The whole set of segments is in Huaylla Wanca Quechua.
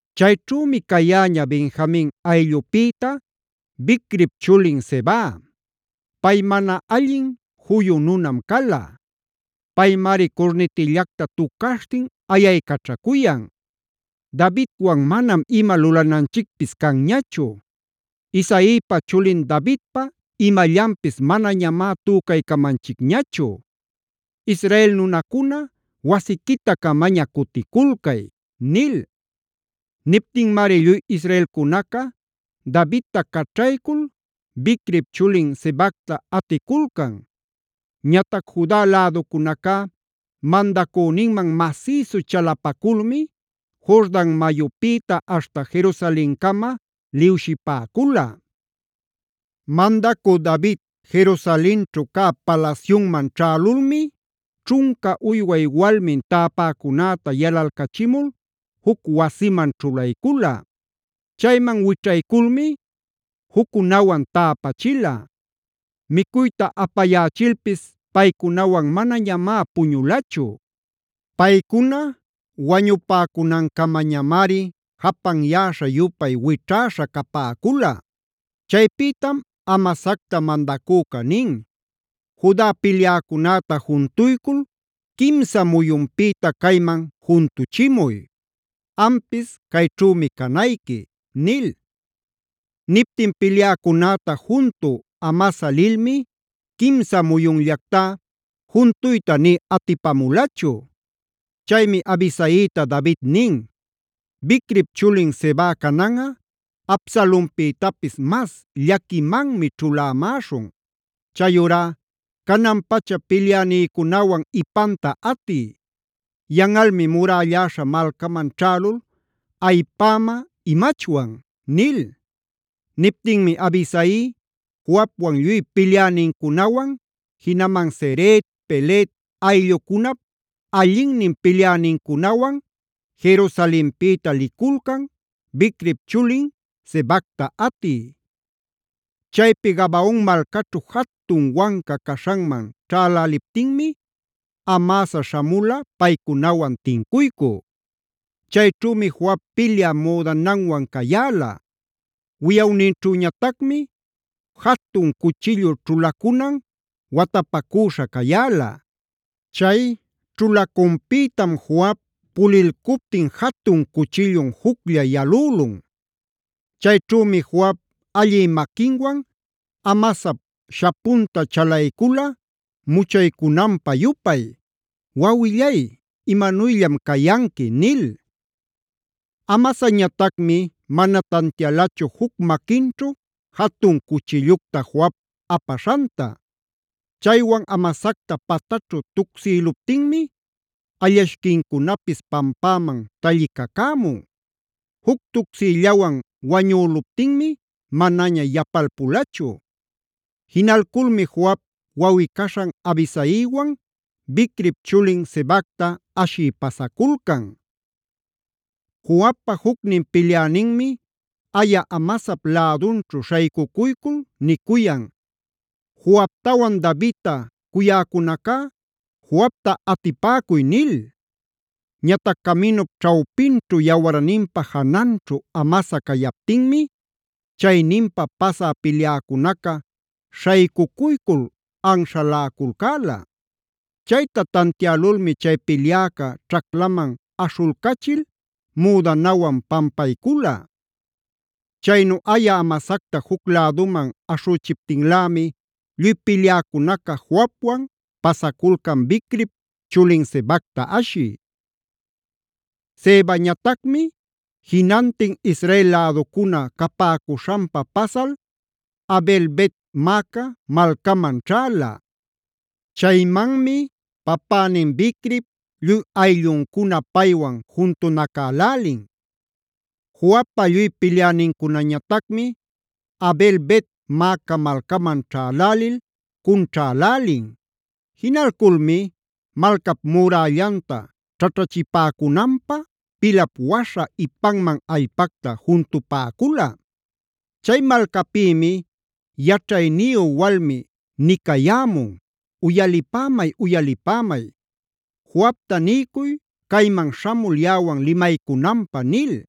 Chayćhümi cayäña Benjamin ayllupïta Bicrip chulin Seba. Pay mana allin juyu nunam cala. Paymari curnitillacta tucaśhtin ayaycaćhacuyan: “Davidwan manam ima lulananchicpis canñachu; Isaipa chulin Davidpa imallanpis manañamá tücaycamanchicñachu. ¡Israel nunacuna wasiquita-camaña cuticulcay!” Niptinmari lluy israelcunaca Davidta caćhaycul Bicrip chulin Sebacta aticulcan. Ñatac Juda läducunacá mandacüninman masïsu chalapaculmi Jordan mayupïta aśhta Jerusalencama liwshipäcula. Mandacü David Jerusalenćhu cä palasyunman ćhälulmi ćhunca uyway walminb täpäcunäta yalalcachimul juc wasiman ćhulaycula. Chayman wićhayculmi juccunawan täpachila. Micuyta apayächilpis paycunawan manañamá puñulachu. Paycuna wañupäcunancamañamari japanyäśha-yupay wićhäśha capäcula. Chaypïtam Amasacta mandacüca nin: “Juda pilyäcunäta juntuycul quimsa muyunpïta cayman juntuchimuy. Ampis cayćhümi canayqui” nil. Niptin pilyäcunäta juntü Amasa lilmi quimsa muyunllactá juntuyta nï atipamulachu. Chaymi Abisaita David nin: “Bicrip chulin Seba cananꞌa Absalonpïtapis mas llaquimanmi ćhulämäśhun. Chayurá canan-pacha pilyänïcunawan ipanta atiy. Yanꞌalmi murällaśha malcaman ćhälul ayipäma imachwan” nil. Niptinmi Abisai Joabwan lluy pilyänincunawan, jinaman Ceret, Pelet ayllucunap allinnin pilyänincunawan Jerusalenpïta liculcan Bicrip chulin Sebacta atï. Chaypi Gabaon malcaćhu jatun wanca caśhanman ćhäläliptinmi Amasa śhamula paycunawan tincuycü. Chayćhümi Joab pilyä müdananwan cayäla; wiyawninćhüñatacmi jatun cuchillu ćhulacunan watapacüśha cayäla. Chay ćhulacunpïtam Joab pulilcuptin jatun cuchillun juclla yalülun. Chayćhümi Joab allï maquinwan Amasap shapunta chalaycula muchaycunanpä-yupay: “Wawillay, ¿imanuyllam cayanqui?” nil. Amasañatacmi mana tantialachu juc maquinćhu jatun cuchillucta Joab apaśhanta. Chaywan Amasacta pataćhu tucsïluptinmi allashquincunapis pampäman tallicacämun. Juc tucsiyllawan wañüluptinmi manaña yapalpulachu. Jinalculmi Joab wawꞌi-caśhan Abisaiwan Bicrip chulin Sebacta ashï pasaculcan. Joabpa jucnin pilyäninmi aya Amasap lädunćhu śhaycucuycul nicuyan: “¡Joabtawan Davidta cuyäcunacá, Joabta atipäcuy!” nil. Ñatac caminup ćhawpinćhu yawarninpa jananćhu Amasa cayaptinmi chayninpa pasä pilyäcunaca śhaycucuycul anśhaläculcäla. Chayta tantiälulmi chay pilyäca ćhaclaman aśhulcachil müdanawan pampaycula. Chaynu aya Amasacta juc läduman aśhüchiptinlämi lluy pilyäcunaca Joabwan pasaculcan Bicrip chulin Sebacta ashï. Sebañatacmi jinantin Israel läducuna capäcuśhanpa pasal Abel-bet-maaca malcaman ćhäla. Chaymanmi papänin Bicrip lluy aylluncuna paywan juntunacälälin. Joabpa lluy pilyänincunañatacmi Abel-bet-maaca malcaman ćhälälil cunćhälälin. Jinalculmi malcap murällanta ćhaćhachipäcunanpä pilap waśha ipanman allpacta juntupäcula. Chay malcapïmi yaćhayniyu walmi nicayämun: “Uyalipämay, uyalipämay; Joabta niycuy cayman śhamul yaꞌawan limaycunanpä” nil.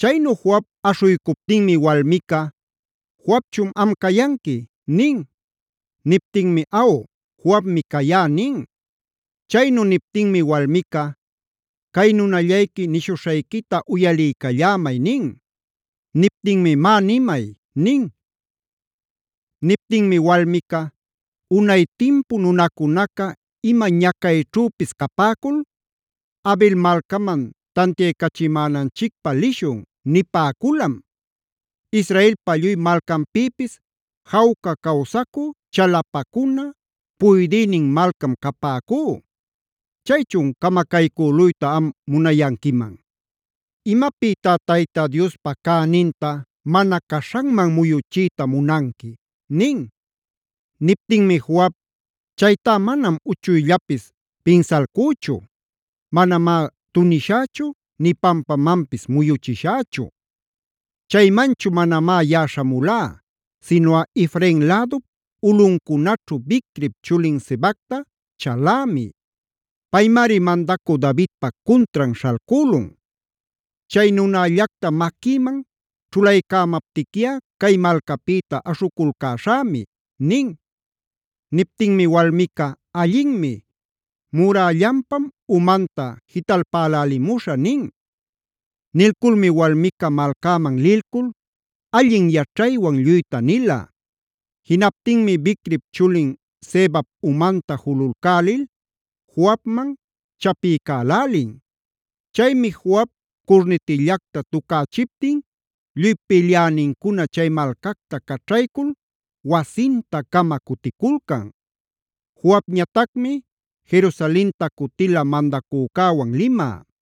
Chaynu Joab aśhuycuptinmi walmica: “¿Joabchun am cayanqui?” nin. Niptinmi: “Aw, Joabmi cayá” nin. Chaynu niptinmi walmica: “Cay nunallayqui nishuśhayquita uyaliycallämay” nin. Niptinmi: “Má, nimay” nin. Niptinmi walmica: “Unay timpu nunacunaca ima ñacayćhüpis capäcul: ‘Abel malcaman tantiaycachimänanchicpä lishun’ nipäculam. Israelpa lluy malcanpïpis jawca cawsacü, chalapacuna, puydïnin malcam capäcú. Chaychun ¡camacaycüluyta am munayanquiman! ¿Imapïtá Tayta Diospa cäninta mana caśhanman muyuchiyta munanqui?” nin. Niptinmi Joab: “Chaytá manam uchuyllapis pinsalcüchu. Manamá tunishächu nï pampamanpis muyuchishächu. Chaymanchu manamá yaꞌa śhamulá sinuꞌa Efrain lädup ulꞌuncunaćhu Bicrip chulin Sebacta chalämi. Paymari mandacü Davidpa cuntran śhalcülun. Chay nunällacta maquïman ćhulaycämaptiquiꞌa cay malcapïta aśhuculcaśhämi” nin. Niptinmi walmica: “Allinmi, murällanpam umanta jitalpälälimuśhä” nin. Nilculmi walmica malcäman lilcul allin yaćhaywan lluyta nila. Jinaptinmi Bicrip chulin Sebap umanta jululcälil Joabman chapiycälälin. Chaymi Joab curnitillacta tucächiptin lluy pilyänincuna chay malcacta caćhaycul wasinta-cama cuticulcan. Joabñatacmi Jerusalenta cutila mandacücäwan limä.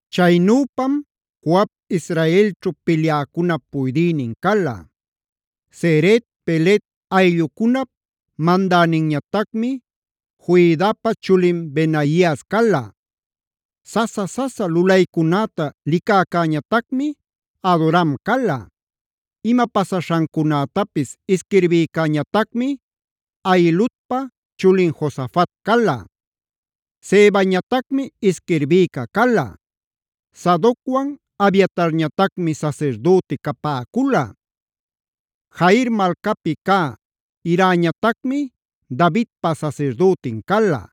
Chaynüpam Joab Israelćhu pilyäcunap puydïnin cala. Ceret, Pelet ayllucunap mandäninñatacmi Joiadapa chulin Benaias cala. Sasa-sasa lulaycunäta licäcäñatacmi Adoram cala. Ima pasaśhancunätapis isquirbïcäñatacmi Ahiludpa chulin Josafat cala. Sevañatacmi isquirbïca cala. Sadocwan Abiatarñatacmi sasirdüti capäcula. Jair malcapi cä Irañatacmi Davidpa sasirdütin cala.